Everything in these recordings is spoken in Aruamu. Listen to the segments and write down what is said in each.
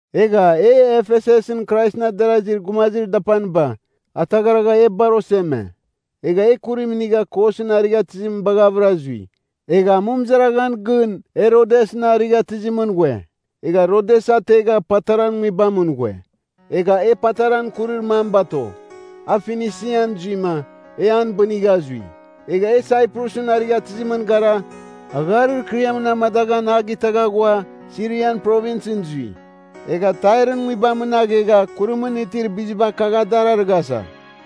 Egha e, Efesusɨn Kraisɨn adarazir gumazir dapaniba, ataghragha e bar oseme. Egha e kurim inigha Kosɨn arighatɨzim baghavɨra zui. Egha amɨmɨzaraghan gɨn e Rodesɨn arighatɨzimɨn ghue. Egha Rodes ategha Pataran nguibamɨn ghue. Egha e Pataran kurir mam bato. A Finisian zuima, e an bɨnigha zui. Egha e Saiprusɨn arighatɨzimɨn gara, agharir kɨriamɨn amadaghan a gitagha ghua, Sirian Provinsɨn zui. Egha Tairɨn nguibamɨn aghegha kurimɨn itir biziba kagh dar arighasa.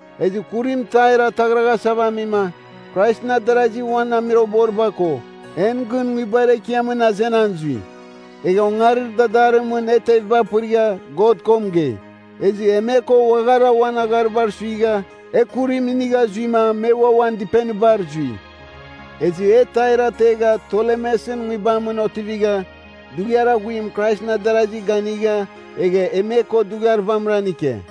Ezɨ kurim Tair ataghraghasava amima, Kraisɨn adarazi uan amuiroghboriba ko, en gɨn nguibar ekiamɨn azenan zui. Egha ongarir dadarimɨn e teviba pɨrigha God ko mɨgei. Ezɨ e me ko uaghara uan agharibar suigha, e kurim inigha zuima me ua uan dɨpenibar zui. Ezɨ e Tair ategha Tolemesɨn nguibamɨn otivigha, dughiar aghuim Kraisɨn adarasi ganigha egha e me ko dughiar vamɨran ike.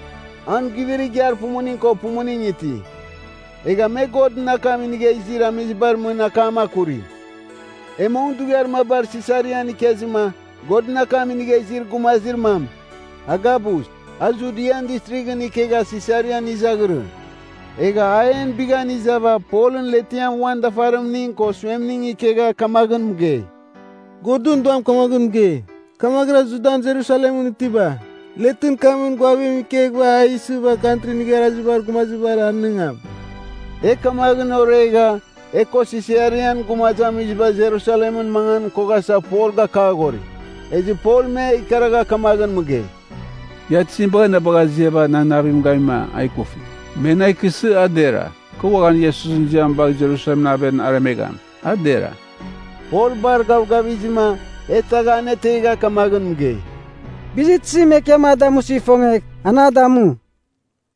An guivir igiar pumuning ko pumuning iti, egha me Godɨn akam inigha izir amizibar mɨn akam akuri. E mong dughiar maba Sisarian ikezɨma, Godɨn akam inigha izir gumazir mam, Agabus, a Judian Distrighɨn ikegha Sisarian izaghirɨ. Egha a en bighan izava Polɨn letiam uan dafarimning ko suemning ikegha kamaghɨn mɨgei, “Godɨn Duam kamaghɨn mɨgei, ‘Kamaghɨra Judan Jerusalemɨn itiba, letɨn kamɨn ghuavim ikeghɨva a isɨva Kantrin Igharazibar Gumazibar anɨngam.’” E kamaghɨn oregha, e ko Sisarian gumazamiziba Jerusalemɨn mangan koghasa Pol gakaghori. Ezɨ Pol me ikaragha kamaghɨn mɨgei, “Ia tizim bagha aziava nan navim gamima a ikufi? Me na ikɨsɨ, a dera. Kɨ uaghan Iesusɨn ziam bagh Jerusalemɨn aven aremegham, a dera.” Pol bar gavgavizɨma e tagha anetegha kamaghɨn mɨgei, “Bizir tizim Ekiam a damusɨ ifongegh, an a damu.”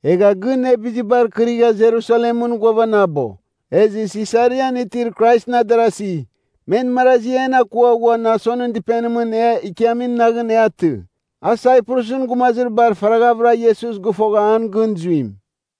Egha gɨn e bizibar kɨrigha Jerusalemɨn ghuavanabo. Ezɨ Sisarian itir Kraisɨn adarasi, men marazi en akua ghua Nasonɨn dɨpenimɨn e ikiamin naghɨn e atɨ. A Saiprusɨn gumazir bar faraghavɨra Iesus gɨfogha an gɨn zuim.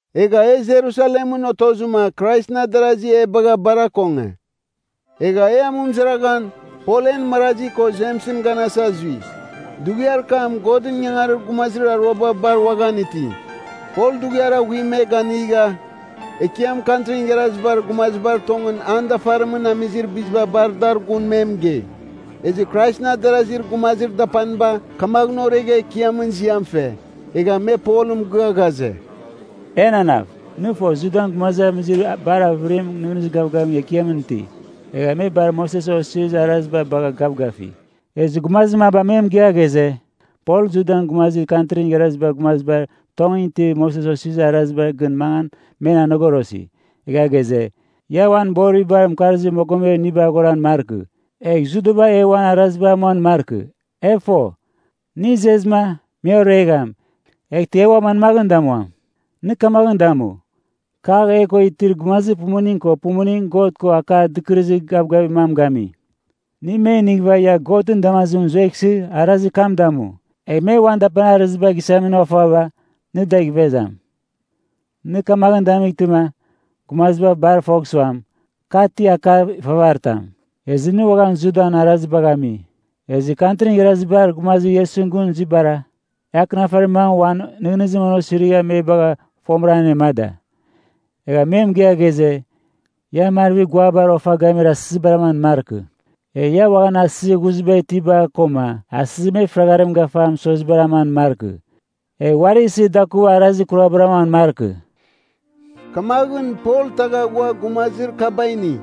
Egha e Jerusalemɨn otozɨma Kraisɨn adarasi e bagha bar akonge. Egha e amɨmɨzaraghan, Pol en marazi ko Jemsɨn ganasa zui. Dughiar kam Godɨn ingangarir gumazir aruaba bar uaghan iti. Pol dughiar aghuim me ganigha, Ekiam Kantrin Igharazibar Gumazibar tongɨn an dafarimɨn amizir biziba bar dar gun me mɨgei. Ezɨ Kraisɨn adarazir gumazir dapaniba kamaghɨn oregha Ekiamɨn ziam fe. Egha me Polɨn mɨgɨa ghaze, “Enanav, nɨ fo Judan gumazamizir bar avɨriba nɨghnɨzir gavgavim Ekiamɨn iti. Egha me bar Moses Osirizir Araziba bagha gavgafi. Ezɨ gumazir maba me mɨgɨa ghaze, Pol Judan gumazir Kantrin Igharazibar Gumazibar tongɨn itibar Moses Osirizir Arazibar gɨn mangan men anogorosi. Egha ghaze, ia uan boribar mɨkarzir mogomebar iniba aghoran markɨ, egh Judaba e uan arazibar amuan markɨ. E fo, nɨ izezɨma, me oregham, eghtɨ e ua manmaghɨn damuam? Nɨ kamaghɨn damu. Kagh e ko itir gumazir pumuning ko pumuning God ko akar dɨkɨrɨzir gavgavir mam gami. Nɨ me inighɨva ia Godɨn damazimɨn zueghsɨ, arazir kam damu. Egh me uan dapanir arɨziba gisamin ofaba, nɨ adagh ivezam. Nɨ kamaghɨn damightɨma, gumaziba bar fogh suam, ka ti akar ifavaritam, ezɨ nɨ uaghan Judan arazibagh ami. Ezɨ Kantrin Igharazibar Gumazir Iesusɨn gɨn zuibara, e akɨnafarir mamɨn uan nɨghnɨzim osirigha me bagha fomɨra anemada. Egha me mɨgɨa ghaze, ia marvir guabar ofa gamir asɨzibar aman markɨ. Egh ia uaghan asɨzir ghuziba itiba koma asɨzir me fɨragharim gafa mɨsozibar aman markɨ, egh uari isɨ dakuva arazir kurabar amuan markɨ.” Kamaghɨn Pol tagha ghua gumazir kaba ini.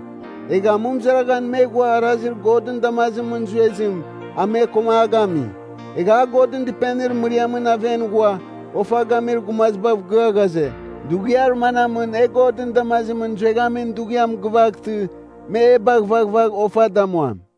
Egha amɨmɨzaraghan me ghua arazir Godɨn damazimɨn zuezim a me koma a gami. Egha a Godɨn Dɨpenir mɨriamɨn aven ghua ofa gamir gumazibav gia ghaze, dughiar manamɨn e Godɨn damazimɨn zueghamin dughiam gɨvaghtɨ me e bagh vaghvagh ofa damuam.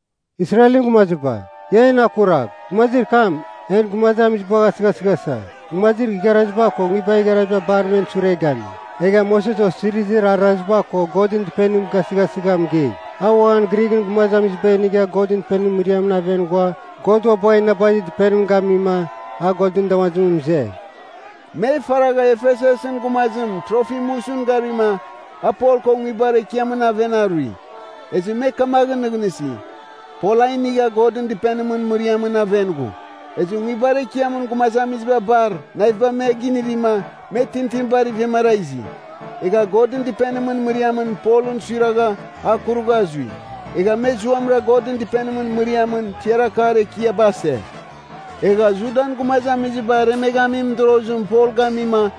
“Israelɨn gumaziba, ia en akuragh! Gumazir kam, en gumazamizibagh asɨghasɨghasa, gumazir igharaziba ko nguibar igharaziba bar men sure gami. Egha Moses Osirizir Araziba ko Godɨn Dɨpenim gasɨghasɨgha mɨgei. A uaghan Grighɨn gumaziba inigha Godɨn Dɨpenimɨn mɨriamɨn aven ghua God ua bagha inabazir dɨpenim gamima a Godɨn damazimɨn mɨze.” (Me faragha Efesusɨn gumazim Trofimusɨn garima, a Pol ko nguibar ekiamɨn aven arui. Ezɨ me kamaghɨn nɨghnɨsi, Pol a inigha Godɨn Dɨpenimɨn mɨriamɨn aven ghu.) Ezɨ nguibar ekiamɨn gumazamiziba bar naviba me ginivima, me tintinibar ivemara izi. Egha Godɨn Dɨpenimɨn mɨriamɨn Polɨn suiragha a kurugha zui. Egha me zuamɨra Godɨn Dɨpenimɨn mɨriamɨn tiar akar ekiaba ase. Egha Judan gumazamiziba aremeghamin mɨdorozim Pol gamima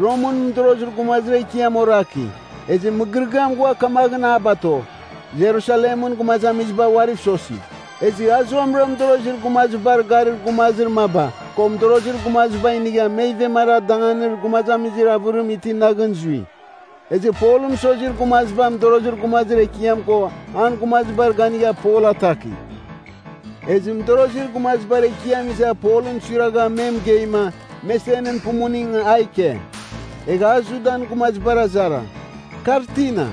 Romɨn mɨdorozir gumazibar ekiam oraki. Ezɨ mɨgɨrɨgɨam ghua kamaghɨn a bato, Jerusalemɨn gumazamiziba uariv sosi. Ezɨ a zuamɨra mɨdorozir gumazibar garir gumazir maba ko mɨdorozir gumaziba inigha me ivemara danganir gumazamizir avɨrim iti naghɨn zui. Ezɨ Polɨn mɨsozir gumaziba mɨdorozir gumazir ekiam ko an gumazibar ganigha Pol ataki. Ezɨ mɨdorozir gumazibar ekiam iza Polɨn suiragha me mɨgeima, me senɨn pumuning a ike. Egha a Judan gumazibar azara, “Kar tina,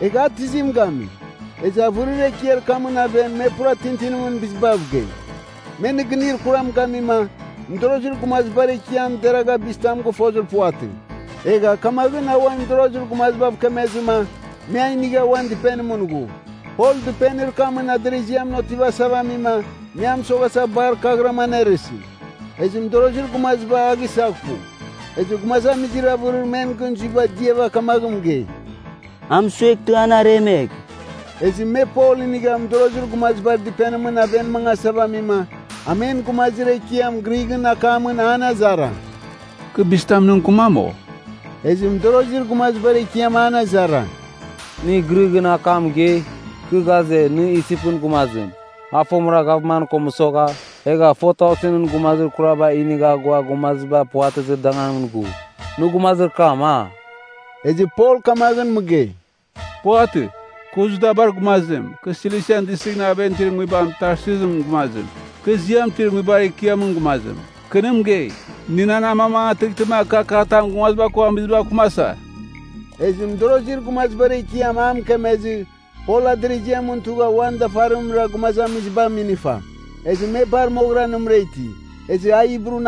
egha a tizim gami?” Ezɨ avɨrir ekiar kamɨn aven me pura tintinimɨn bizibav gei. Me nɨgɨnir kuram gamima, mɨdorozir gumazibar ekiam deragha bizitam gɨfozir puvatɨ. Egha kamaghɨn a uan mɨdorozir gumazibav kemezɨma, me a inigha uan dɨpenimɨn ghu. Pol dɨpenir kamɨn adɨrɨziamɨn otivasava amima me a mɨsoghasa bar kaghɨram anerɨsi. Ezɨ mɨdorozir gumaziba a gisaghpu. Ezɨ gumazamizir avɨrir men gɨn zuiba diava kamaghɨn mɨgei, “A mɨsueghtɨ, an aremegh!” Ezɨ me Pol inigh mɨdorozir gumazibar dɨpenimɨn aven mangasava amima, a men gumazir ekiamɨn Grighɨn akam an azara, “Kɨ bizitam nɨ mɨkɨmam, o?” Ezɨ mɨdorozir gumazibar ekiam an azara, “Nɨ Grighɨn akam mɨgei? Kɨ ghaze, nɨ Isipɨn gumazim, a fomɨra gavman ko mɨsogha, egha 4,000ɨn gumazir kuraba inigha ghua gumaziba puvatɨzir danganimɨn ghu. Nɨ gumazir kam, a?” Ezɨ Pol kamaghɨn mɨgei, “Puvatɨ. Kɨ Judabar gumazim, kɨ Silisian Distrighɨn aven itir nguibam Tarsusɨn gumazim. Kɨ ziam itir nguibar ekiamɨn gumazim. Kɨ nɨ mɨgei, nɨ na amamangatɨghtɨma, kɨ akatam gumaziba ko amizibav kɨmasa.” Ezɨ mɨdorozir gumazibar ekiam a mɨkemezɨ, Pol adɨrɨziamɨn tugha uan dafarimra gumazamiziba aminifa. Ezɨ me bar moghɨra nɨmɨra iti. Ezɨ a